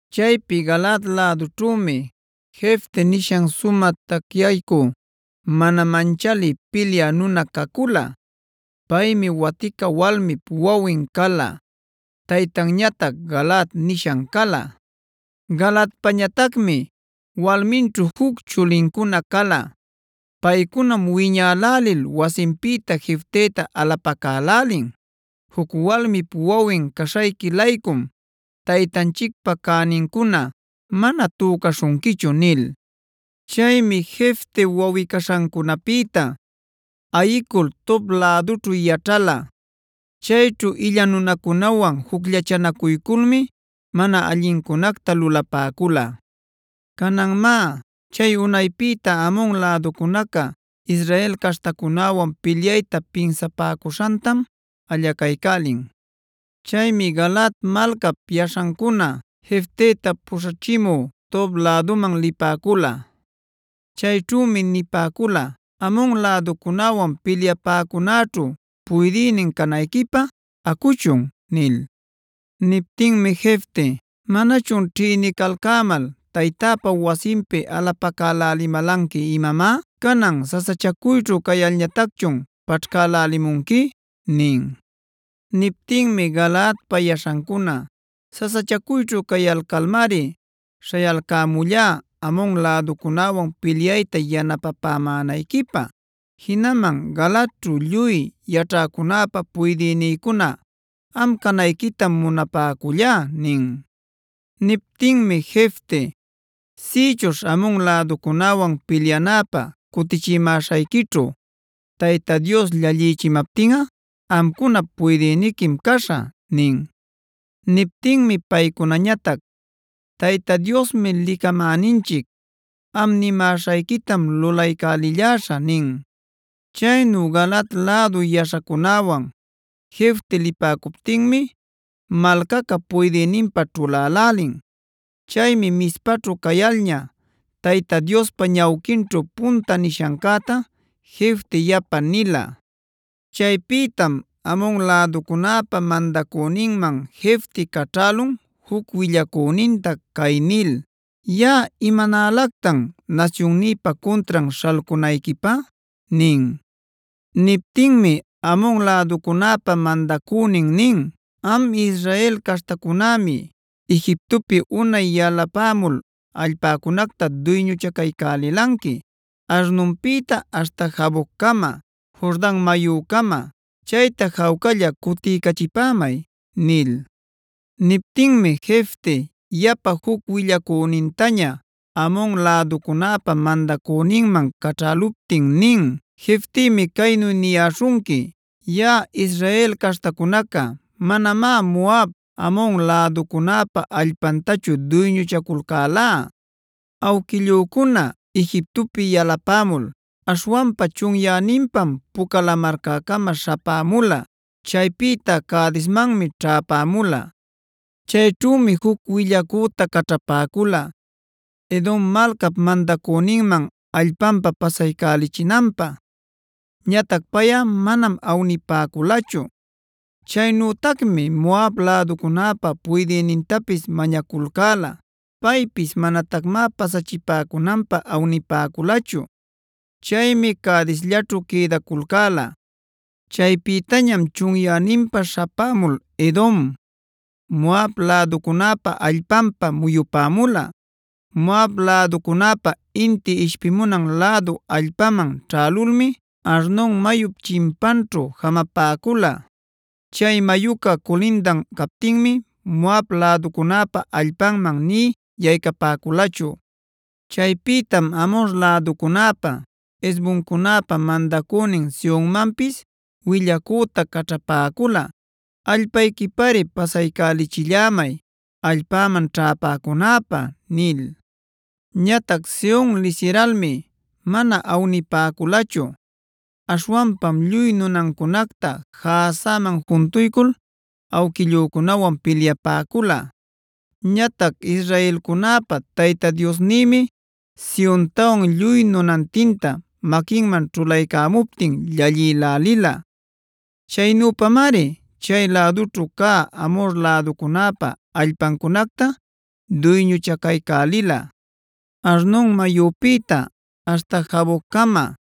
Chaypi Galaad lädućhümi Jeftea nishan sumä tacyaycü, mana manchalï pilyä nuna cacula. Paymi watica walmip wawin cala; taytanñatac Galaad nishan cala. Galaadpañatacmi walminćhu juc chulincuna cala. Paycunam wiñälälil wasinpïta Jefteta alapacälälin: “Juc walmip wawin caśhayqui-laycum taytanchicpa cänincuna mana tücaśhunquichu” nil. Chaymi Jefte wawꞌi-caśhancunapïta ayicul Tob lädućhu yaćhala. Chayćhu illa nunacunawan jucllachanacuyculmi mana allincunacta lulapäcula. Canan má, chay unaypïta Amon läducunaca Israel caśhtacunäwan pilyayta pinsapäcuśhantam allacaycälin. Chaymi Galaad malcap yaśhancuna Jefteta puśhachimü Tob läduman lipäcula. Chayćhümi nipäcula: “Amon läducunäwan pilyapäcunäćhu puydïnin canayquipä acuchun” nil. Niptinmi Jefte: “¿Manachun ćhïnicalcämal taytäpa wasinpi alapacälälimälanqui imamá? ¿Canan sasachacuyćhu cayalñatacchun paćhcälälimunqui?” nin. Niptinmi Galaadpa yaśhancuna: “Sasachacuyćhu cayalcalmari śhayalcämullá Amon läducunäwan pilyayta yanapapämänayquipä. Jinaman Galaadćhu lluy yaćhäcunäpa puydïnïcuna am canayquitam munapäcullá” nin. Niptinmi Jefte: “Sïchuśh Amon läducunäwan pilyanäpä cutichimäśhayquićhu, Tayta Dios llallïchimaptinꞌa amcunap puydïniquim caśhä” nin. Niptinmi paycunañatac: “Tayta Diosmi licamäninchic; am nimäśhayquitam lulaycälilläśhä” nin. Chaynu Galaad lädu yaśhacunäwan Jefte lipäcuptinmi malcaca puydïninpä ćhulälälin. Chaymi Mizpaćhu cayalña Tayta Diospa ñawquinćhu punta nishancäta Jefte yapa nila. Chaypïtam Amon läducunäpa mandacüninman Jefte caćhälun juc willacüninta cay nil: “¿Yaꞌa imanälactan nasyunnïpa cuntran śhalcunayquipä?” nin. Niptinmi Amon läducunäpa mandacünin nin: “Am Israel caśhtacunämi Egiptopi unay yalapämul allpäcunacta duyñuchacaycälilanqui Arnonpïta aśhta Jaboccama, Jordan mayucama. Chayta jawcalla cutiycachipämay” nil. Niptinmi Jefte yapa juc willacünintaña Amon läducunäpa mandacüninman caćhäluptin nin: “Jeftemi caynu niyäśhunqui: Yaꞌa Israel caśhtacunaca manamá Moab, Amon läducunäpa allpantachu duyñuchaculcäla. Awquillücuna Egiptopi yalapämul aśhwanpa chunyäninpam Puca Lamarcäcama śhapämula; chaypïta Cadesmanmi ćhäpämula. Chayćhümi juc willacüta caćhapäcula Edom malcap mandacüninman allpanpa pasaycälichinanpä. Ñatac payꞌa manam awnipäculachu.b Chaynütacmi Moab läducunäpa puydïnintapis mañaculcäla. Paypis manatacmá pasachipäcunanpä awnipäculachu. Chaymi Cadesllaćhu quïdaculcäla. Chaypitañam chunyäninpa śhapämul Edom,c Moab läducunäpa allpanpa muyupämula. Moab läducunäpa inti ishpimunan lädu allpanman ćhälulmi Arnon mayup chimpanćhu jamapäcula. Chay mayuca culindan captinmi Moab läducunäpa allpanman nï yaycapäculachu. Chaypïtam Amhor läducunäpa, Hesboncunäpa mandacünin Sehonmanpis willacüta caćhapäcula: ‘Allpayquipari pasaycälichillämay allpäman ćhäpäcunäpä’ nil. Ñatac Sehon lisiralmi mana awnipäculachu. Aśhwanpam lluy nunancunacta Jahazaman juntuycul awquillücunawan pilyapäcula. Ñatac israelcunäpa Tayta Diosnïmi Sehontawan lluy nunantinta maquinman ćhulaycämuptin llallïlälila. Chaynüpamari chay lädućhu cä Amhor läducunäpa allpacunacta duyñuchacaycälila: Arnon mayupïta aśhta Jaboccama;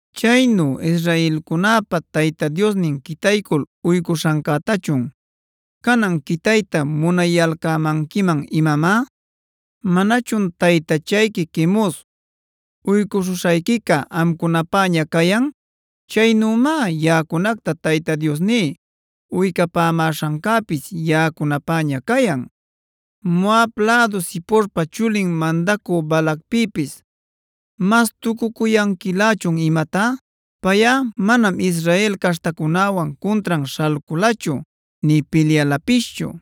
Chaynu israelcunäpa Tayta Diosnin quitaycul uycuśhancätachun, ¿canan quitayta munayalcämanquiman imamá? ¿Manachun taytachayqui Quemos uycuśhuśhayquica amcunapäña cayan? Chaynümá yaꞌacunacta Tayta Diosní uycapämäśhancäpis yaꞌacunapäña cayan. ¿¡Moab lädu Ziporpae chulin mandacü Balacpïpis mastucucuyanquilächun imatá!? Payꞌa manam Israel caśhtacunäwan cuntran śhalculachu nï pilyalapischu.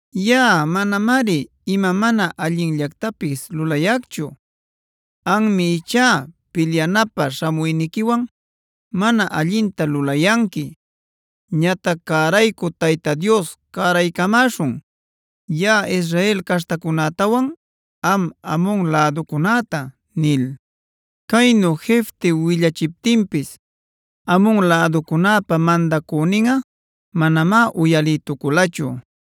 Yaꞌa manamari ima mana allinllactapis lulayacchu. Anmi ichá pilyanapä śhamuyniquiwan mana allinta lulayanqui. Ñatac cäraycü Tayta Dios cäraycamäśhun yaꞌa Israel caśhtacunätawan am Amon läducunäta” nil. Caynu Jefte willachiptinpis Amon läducunäpa mandacüninꞌa manamá uyalïtuculachu.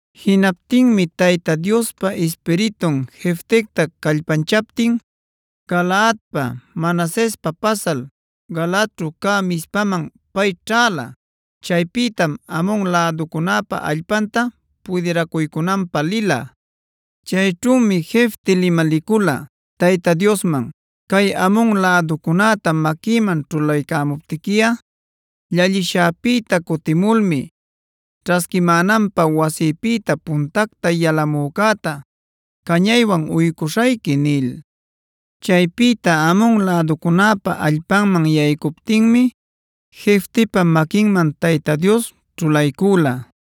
Jinaptinmi Tayta Diospa Ispiritun Jeftecta callpanchaptin Galaadpa, Manasespa pasal Galaadćhu cä Mizpaman pay ćhäla. Chaypïtam Amon läducunäpa allpanta pudiracuycunanpä lila. Chayćhümi Jefte limalicula Tayta Diosman: “Cay Amon läducunäta maquïman ćhulaycämuptiquiꞌa, llallishäpïta cutimulmi ćhasquimänanpä wasïpïta puntacta yalamücäta cañaywan uycuśhayqui” nil. Chaypïta Amon läducunäpa allpanman yaycuptinmi Jeftepa maquinman Tayta Dios ćhulaycüla.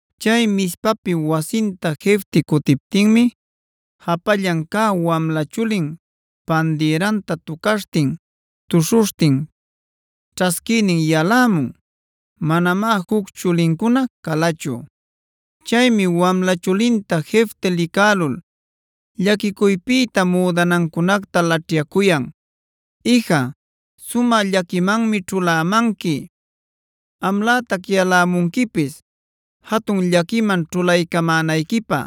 Chay Mizpapi wasinta Jefte cutiptinmi japallan cä wamla chulin pandirïtanta tucaśhtin, tuśhuśhtin ćhasquïnin yalämun. Manamá juc chulincuna calachu. Chaymi wamla chulinta Jefte licälul llaquicuypïta müdanancunacta laćhyacuyan: “Ija, sumä llaquimanmi ćhulämanqui. Amlätac yalämunquipis jatun llaquiman ćhulaycamänayquipä.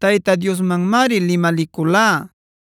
Tayta Diosmanmari limaliculá,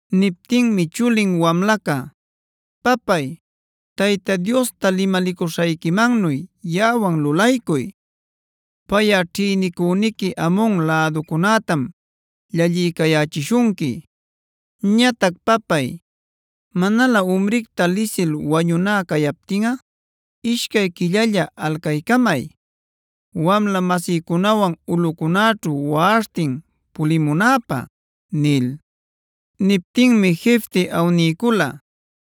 Niptinmi chulin wamlaca: “Papay, Tayta Diosta limalicuśhayquimannu yaꞌawan lulaycuy. Payꞌa ćhïnicüniqui Amon läducunätam llalliycayächishunqui. Ñatac papay, manalä umricta lisil wañuná cayaptinꞌa ishcay quillalla alcaycamay, wamla-masïcunawan ulꞌucunäćhu waꞌaśhtin pulimunäpä” nil. Niptinmi Jefte awniycula.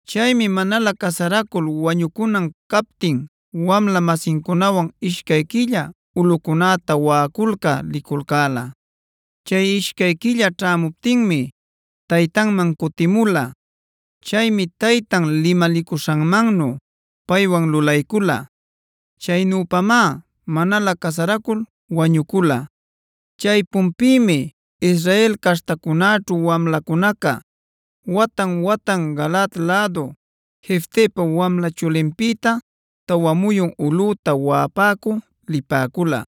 Chaymi manalä casaracul wañucunan captin wamla-masincunawan ishcay quilla ulꞌucunäta waꞌaculcä liculcäla. Chay ishcay quilla ćhämuptinmi taytanman cutimula. Chaymi taytan limalicuśhanmannu paywan lulaycula. Chaynüpamá manalä casaracul wañucula. Chaypunpïmi Israel caśhtacunäćhu wamlacunaca watan-watan Galaad lädu Jeftepa wamla chulinpïta tawa muyun ulꞌüta waꞌapäcü lipäcula.